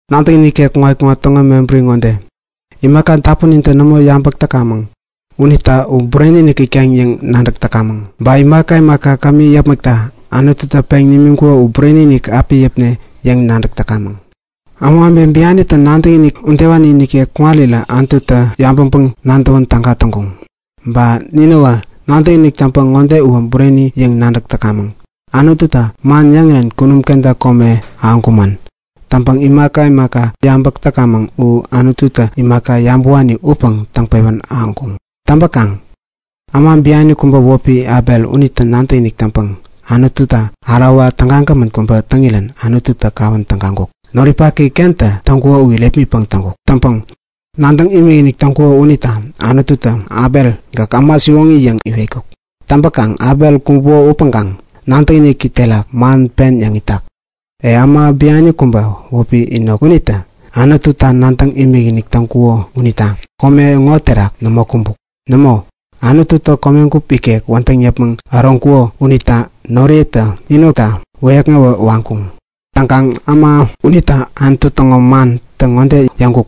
Nadäkinik ikek kuŋat-kuŋat täŋo mebäri ŋode; Imaka dapunintä nämo yabäk täkamäŋ unita U bureni-inik itkaŋ yäŋ nadäk täkamäŋ. Ba imaka imaka kämi yäpmäkta Anututä peŋ nimiŋkuko u bureni-inik api yäpne yäŋ nadäk täkamäŋ. Ämawebe bianitä nadäkinik udewani nikek kuŋarirä Anututä yabäŋpäŋ-nadäwän täga täŋkuŋ. Ba ninäwä nadäkinik täŋpäŋ ŋode uwä bureni yäŋ nadäk täkamäŋ; Anututä man yäŋirän kunum kenta kome ahäŋkumän. Täŋpäŋ imaka imaka yabäk täkamäŋ u Anututä imaka nämo yabäwani upäŋ täŋpewän ahäŋkuŋ yäŋ nadäk täkamäŋ. Täŋpäkaŋ äma biani kubä wäpi Abel unitä nadäkinik täŋpäŋ Anututa ärawa tägagämän kubä täŋirän Anututä kawän tägaŋkuk. Noripaki Kentä täŋkuko u irepmitpäŋ täŋkuk. Täŋpäŋ nadäŋ imikinik täŋkuko unita Anututä Abel, Gäk äma siwoŋi yäŋ iwetkuk. Täŋpäkaŋ Abel kumbuko upäŋkaŋ nadäkiniki terak man pen yäŋ itak. E, äma biani kubä wäpi Enok unitä Anututa nadäŋ imikinik täŋkuko unita kome ŋo terak nämo kumbuk. Nämo, Anututä komegup ikek wädäŋ yäpmäŋ äroŋkuko unita noriyetä Enokta wäyäkŋewä waŋkuŋ. Täŋkaŋ äma unita Anutu täŋo mantä ŋode yäŋkuk;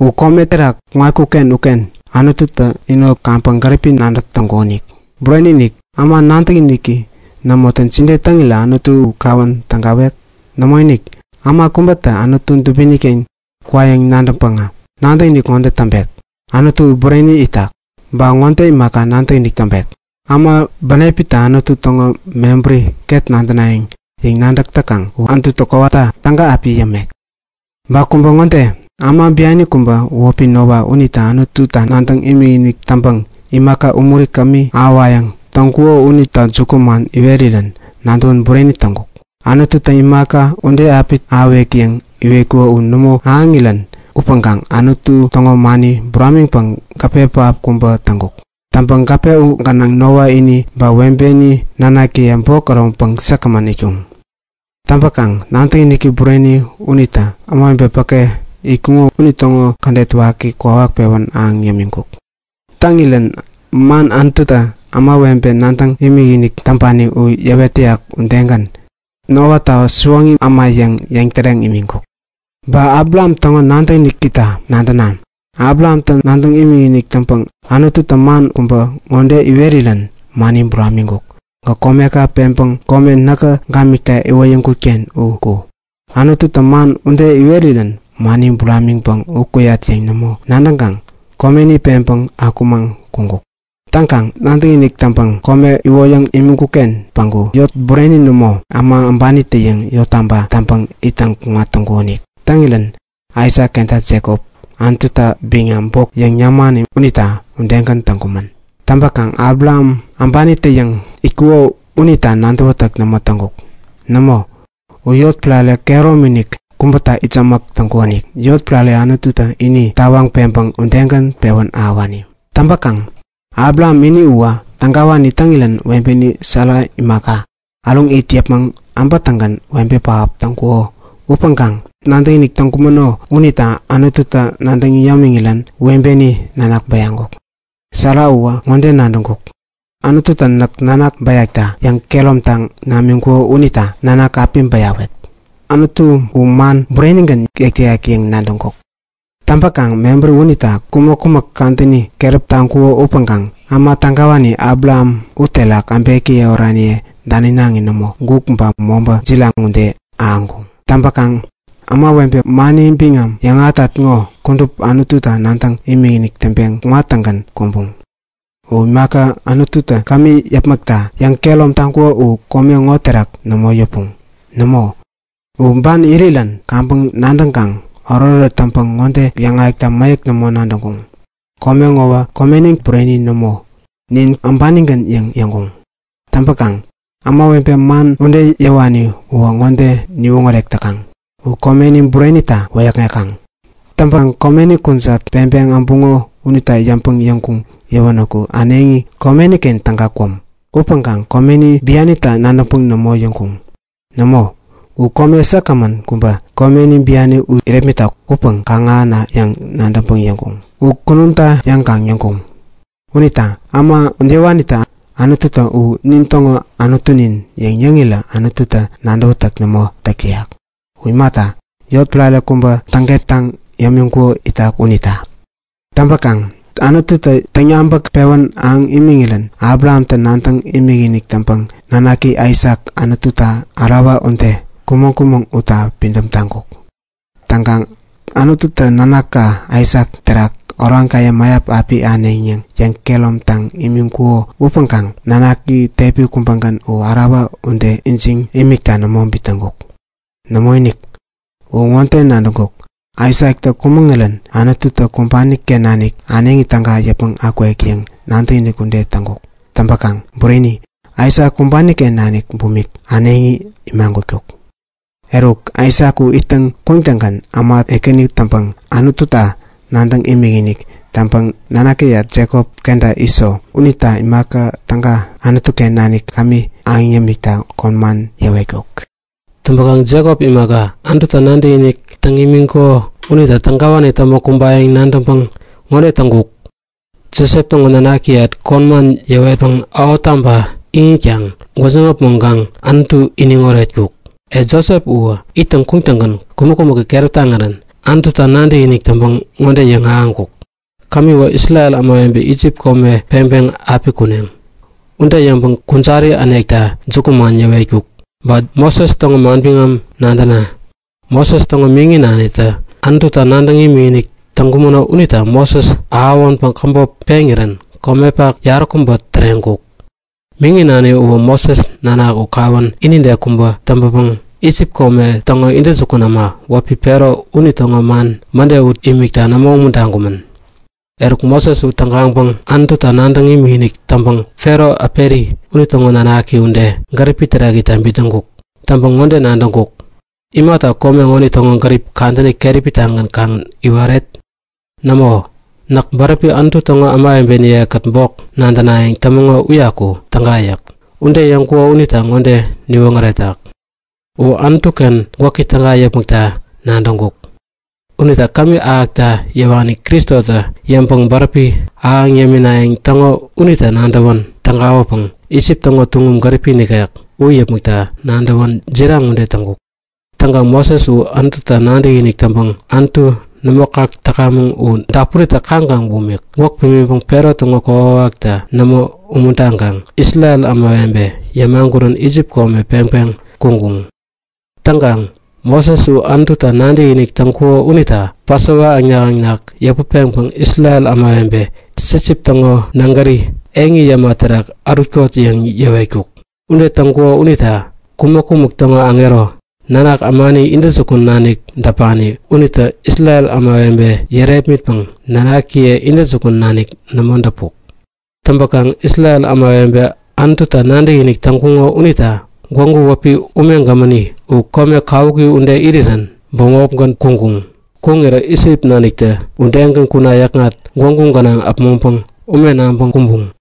U kome terak kuŋatkuk-ken uken Anututä Enok kaŋpäŋ gäripi nadäk täŋkukonik. Bureni-inik, äma nadäkiniki nämotä jide täŋirän Anututä u kawän tägawek? Nämoinik, äma kubätä Anutu dubini-ken kwayäŋ nadäŋpäŋä nadäkinik ŋode täŋpek; Anutu u bureni itak. Ba ŋode imaka nadäkinik täŋpek; Äma bänepitä Anutu täŋo mebärini ket nadänayäŋ yäŋ nadäk täkaŋ u Anututä kowata täga api yämek. Ba kubä ŋode; Äma biani kubä wäpi Noa unitä Anututa nadäŋ imikinik täŋpäŋ imaka umuri kämi ahäwayäŋ täŋkuko unita jukuman iwerirän nadäwän bureni täŋkuk. Anututä imaka ude api ahäwek yäŋ iwetkuko u nämo ahäŋirän upäŋkaŋ Anutu täŋo mani buramiŋpäŋ gäpe pähap kubä täŋkuk. Täŋpäŋ gäpe u gänaŋä Noa ini ba webeni nanakiye bok äroŋpäŋ säkgämän itkuŋ. Täŋpäkaŋ nadäkiniki bureni unitä ämawebe päke itkuŋo unitäŋo kädet waki kwawak pewän ahäŋ yämiŋkuk. Täŋirän man Anututä ämawebe nadäŋ imikinik täŋpani u yäwet täyak udegän, Noata siwoŋi äma yäŋ yäŋtäreŋ imiŋkuk. Ba Abraham täŋo nadäkinikita nadäna; Abrahamtä nadäŋ imikinik täŋpäŋ Anututä man kubä ŋode iwerirän mani buramiŋkuk; Gäk komeka peŋpäŋ kome näkä gamikta iwoyäŋkut-ken u ku! Anututä man ude iwerirän mani buramiŋpäŋ u kuyat yäŋ nämo nadäŋkaŋ, komeni peŋpeŋ akumaŋ kuŋkuk. Täŋkaŋ nadäkinik täŋpäŋ kome iwoyäŋ imani-ken päŋku yot bureni nämo, äma äbanitä-yäŋ yottaba täŋpäŋ ittäŋ kuŋat täŋkukonik. Täŋirän Aisak kenta Jekop Anututä biŋam bok yäŋ yämani unitä udegän täŋkumän. Täŋpäkaŋ Abraham äbanitä-yäŋ itkuko unita nadäwätäk nämo täŋkuk. Nämo, u yotpärare kehäromi-inik kubäta itsämäk täŋkukonik, yotpärare Anututä ini tawaŋ peŋpäŋ udegän pewän ahäwani. Täŋpäkaŋ Abraham ini uwä tägawani täŋirän webeni Sara imaka, äruŋ it yäpmäŋ äbätäŋgän webe pähap täŋkuko upäŋkaŋ nadäkinik täŋkumäno unita Anututä nadäŋ yämiŋirän webeni nanak bäyaŋkuk. Sara uwä ŋode nadäŋkuk; Anututä näk nanak bäyakta yäŋkehäromtaŋ namiŋkuko unita nanak api bäyawet. Anutu u man burenigän yäk täyak yäŋ nadäŋkuk. Täŋpäkaŋ mebäri unita kumäk-kumäk kadäni keräp taŋkuko upäŋkaŋ äma tägawani Abraham uterak äbekiye oraniye daninaŋi nämo, guk ba mobä jiraŋ ude ahäŋkuŋ. Täŋpäkaŋ ämawebe mani biŋam yäŋahätat ŋo kudup Anututa nadäŋ imikinik täŋpeŋ kuŋat-tägän kumbuŋ. U imaka Anututä kämi yäpmäkta yäŋkehärom taŋkuko u kome ŋo terak nämo yäpuŋ. Nämo, u ban irirän kaŋpäŋ nadäŋkaŋ oretoret täŋpäŋ ŋode yäŋahäkta mäyäk nämo nadäŋkuŋ; Kome ŋowä komenin bureni nämo, nin äbanigän yäŋ yäŋkuŋ. Täŋpäkaŋ ämawebe man ude yäwani uwä ŋode niwoŋärek täkaŋ; U komeni burenita wäyäkŋekaŋ. Täŋpäŋ komeni kujat peŋpeŋ äbuŋo unita yäŋpäŋ yäŋkuŋ yäwänäku äneŋi komeni-ken täga kwäm. Upäŋkaŋ komeni bianita nadäŋpäŋ nämo yäŋkuŋ. Nämo, u kome säkgämän kubä, komeni biani u irepmitak upäŋ kaŋ-ahäna yäŋ nadäŋpäŋ yäŋkuŋ. U kunumta yäŋkaŋ yäŋkuŋ. Unita äma udewanitä Anututa U nin täŋo Anutunin yäŋ yäŋirä Anututä nadäwätäk nämo täk täyak. U imata, yotpärare kubä täŋkettaŋ yämiŋkuko itak unita. Täŋpäkaŋ Anututä täŋyabäk pewän ahäŋ imiŋirän Abrahamtä nadäŋ imikinik täŋpäŋ nanaki Aisak Anututa ärawa ude kumäŋ-kumäŋ utta pidäm taŋkuk. Täŋkaŋ Anututä nanaka Aisak terak oraŋkaye mäyap api ahäneŋ yäŋ yäŋkehäromtaŋ imiŋkuko upäŋkaŋ nanaki tepi kubägän u ärawa ude ijiŋ imikta nämo bitnäŋkuk. Nämoinik, u ŋode nadäŋkuk; Aisaktä kumäŋirän Anututä kumbani-ken nanik äneŋi täga yäpmäŋ akwek yäŋ nadäkinik ude täŋkuk. Täŋpäkaŋ bureni, Aisak kumbani-ken nanik bumik äneŋi imagutkuk. Eruk Aisak u ittäŋ kuŋtäŋgän äma ekäni täŋpäŋ Anututa nadäŋ imikinik täŋpäŋ nanakiyat Jekop kenta Iso unita imaka täga Anutu-ken nanik kämi ahäŋ yämikta kon man yäwetkuk. Täŋpäkaŋ Jekop imaka, Anututa nadäŋ imikinik täŋkuko unita tägawani täŋpäŋ kumbayäŋ nadäŋpäŋ ŋode täŋkuk; Josep täŋo nanakiyat kon man yäwetpäŋ ähottaba iŋitkaŋ gwäjiŋ äpmoŋkaŋ Anutu iniŋ oretkuk. E, Josep uwä ittäŋ kuŋtäŋgän kumäk-kumäki keräp taŋirän Anututa nadäkinik täŋpäŋ ŋode yäŋahäŋkuk; Kämiwä, Isrel ämawebe Isip kome peŋpeŋ api kuneŋ. Ude yäŋpäŋ kujari änekta jukuman yäwetkuk. Ba Moses täŋo manbiŋam nadäna; Moses täŋo miŋi nanitä Anututa nadäŋ imikinik täŋkumäno unita Moses ahäwänpäŋ käbop peŋirän komepak yaräkubä täreŋkuk. Miŋi nani uwä Moses nanak u kawän inide kubä täŋpänpäŋ Isip kome täŋo intäjukun äma wäpi Fero unitäŋo man mäde ut imikta nämo umuntaŋkumän. Eruk Moses u tägaŋpäŋ Anututa nadäŋ imikinik täŋpäŋ Fero äperi unitäŋo nanaki ude, gäripi terak itta bitnäŋkuk. Täŋpäŋ ŋode nadäŋkuk; Imata kome ŋonitäŋo gärip kadäni keräpi-tagän kaŋ iwaret? Nämo, näk bäräpi Anutu täŋo kudupi ämawebeniye-kät bok nadänayäŋ tämäŋo uyaku täga yäk. Ude yäŋkuko unitä ŋode niwoŋäretak; U Anutu-ken gwäki täga yäpmäkta nadäŋkuk. Unita kämi ahäkta yäwani Kristota yäŋpäŋ bäräpi ahäŋ yäminayäŋ täŋo unita nadäwän tägawäpäŋ Isip täŋo tuŋum gäripi nikek u yäpmäkta nadäwän jiraŋ ude täŋkuk. Täŋkaŋ Moses u Anututa nadäkinik täŋpäŋ Anutu nämo kak täkamäŋ u dapuritä kaŋkaŋ bumik gwäk pimiŋpäŋ Fero täŋo kokwawakta nämo umuntaŋkaŋ Isrel ämawebe yämagurän Isip kome peŋpeŋ kuŋkuŋ. Täŋkaŋ Moses u Anututa nadäkinik täŋkuko unita Pasova äŋnak-äŋnak yäput peŋpäŋ Isrel ämawebe sipsip täŋo nägäri eŋi yäma terak ärutkot yäŋ yäwetkuk. Ude täŋkuko unita kumäk-kumäk täŋo aŋero, nanak ämani intäjukun nanik däpani unitä Isrel ämawebe yärepmitpäŋ nanakiye intäjukun nanik nämo däpuk. Täŋpäkaŋ Isrel ämawebe Anututa nadäkinik täŋkuŋo unita gwägu wäpi Ume Gämäni u kome kawuki ude irirän bämopgän kuŋkuŋ. Kuŋirä Isip naniktä udegän kuna yäkŋat gwägu gänaŋ äpmoŋpäŋ ume naŋpäŋ kumbuŋ.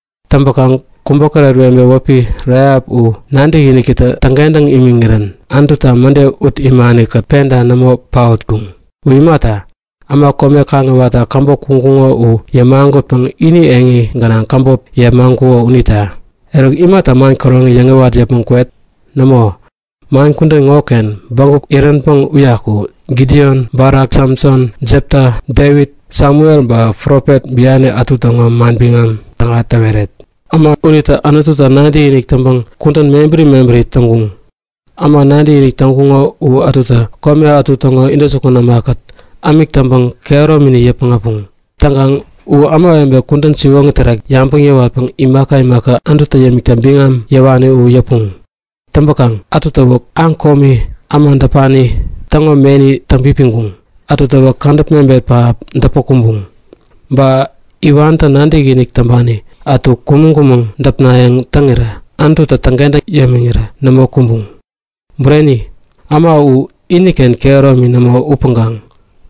Täŋpäkaŋ kubokäret webe wäpi Rahap u nadäkinikitä täŋkentäŋ imiŋirän Anututa mäde ut imani-kät penta nämo paotkuŋ. U imata, äma kome kaŋiwatta käbop kuŋkuŋo u yämagutpäŋ ini eŋi gänaŋ käbop yepmaŋkuko unita. Eruk imata man käroŋi yäŋiwat yäpmäŋ kwet? Nämo, man kudän ŋoken bägup iränpäŋ uyaku Gidion, Balak, Samson, Jepta, Devit, Samuel ba profet biani ätu täŋo manbiŋam täga täweret. Äma unitä Anututa nadäkinik täŋpäŋ kudän mebäri mebäri täŋkuŋ. Äma nadäkinik täŋkuŋo u ätutä kome ätu täŋo intäjukun ämakät ämik täŋpäŋ kehäromini yäpmäŋ äpuŋ. Täŋkaŋ u ämawebe kudän siwoŋi terak yabäŋ yäwatpäŋ imaka imaka Anututä yämikta biŋam yäwani u yäpuŋ. Täŋpäkaŋ ätutäwä aŋ komi, äma däpani täŋo meni täŋpipiŋkuŋ. Ätutäwä kädäp mebet pähap däpä kumbuŋ, ba iwantä nadäkinik täŋpani ätu kumäŋ-kumäŋ däpnayäŋ täŋirä Anututä täŋkentäŋ yämiŋirän nämo kumbuŋ. Bureni, äma uwä iniken kehäromini nämo upäŋkaŋ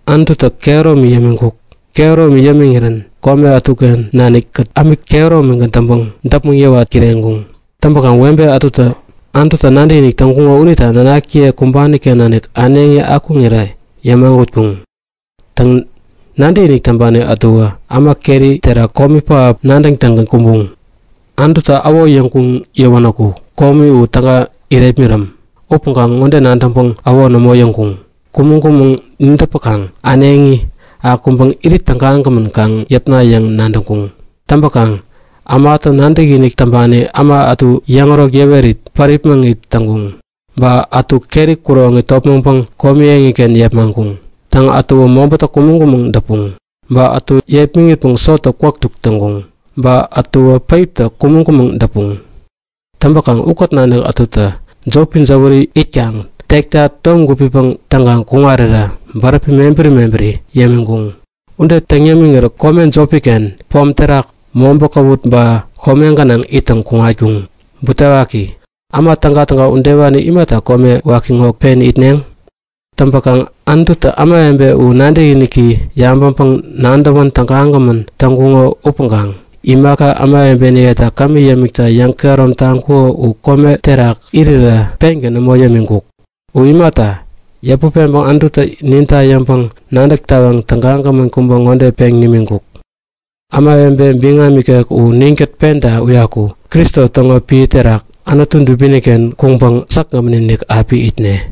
Anututä kehäromi yämiŋkuk. Kehäromi yämiŋirän kome ätuken nanikkät ämik kehäromigän täŋpäŋ däpmäŋ yäwat kireŋkuŋ. Täŋpäkaŋ webe ätutä Anututa nadäkinik täŋkuŋo unita nanakiye kumbani-ken nanik äneŋi akuŋirä yämagutkuŋ. Täŋ, nadäkinik täŋpani ätuwä äma keri terak komi pähap nadäŋtäŋgän kumbuŋ. Anututa äwo yäŋkuŋ yäwänäku komi u täga irepmiräm. Upäŋkaŋ ŋode nadäŋpäŋ äwo nämo yäŋkuŋ; Kumäŋ-kumäŋ nidäpäkaŋ äneŋi akuŋpäŋ irit tägagämän kaŋ yäpna yäŋ nadäŋkuŋ. Täŋpäkaŋ ämatä nadäkinik täŋpani äma ätu yäŋärok yäwerit päripmäŋit täŋkuŋ. Ba ätu keri kuroŋi topmäŋpäŋ komi eŋiken yepmaŋkuŋ. Täŋ, ätuwä mobätä kumäŋ-kumäŋ däpuŋ. Ba ätu yepmiŋitpäŋ sotä kwäk duk täŋkuŋ. Ba ätuwä päiptä kumäŋ-kumäŋ däpuŋ. Täŋpäkaŋ ukät nanik ätutä jopi jäwäri itkaŋ tekta tom gupipäŋ täŋkaŋ kuŋarirä bäräpi mebäri mebäri yämiŋkuŋ. Ude täŋ yämiŋirä kome jopi-ken, pom terak, mobä kawut ba kome gänaŋ ittäŋ kuŋatkuŋ. Butewaki! Äma tägatäga udewani imata kome waki ŋo pen itneŋ? Täŋpäkaŋ Anututä ämawebe u nadäkiniki yabäŋpäŋ-nadäwän tägagämän täŋkuŋo upäŋkaŋ imaka ämawebeniyeta kämi yämikta yäŋkehärom taŋkuko u kome terak irirä pengän nämo yämiŋkuk. U imata, yäput peŋpäŋ Anututä ninta yäŋpäŋ-nadäk tawaŋ tägagämän kubä ŋode peŋ nimiŋkuk; Ämawebe biŋam ikek u ninkät penta päke kubägän Kristo täŋo piä terak Anutu dubini-ken kuŋpäŋ säkgämän-inik api itne.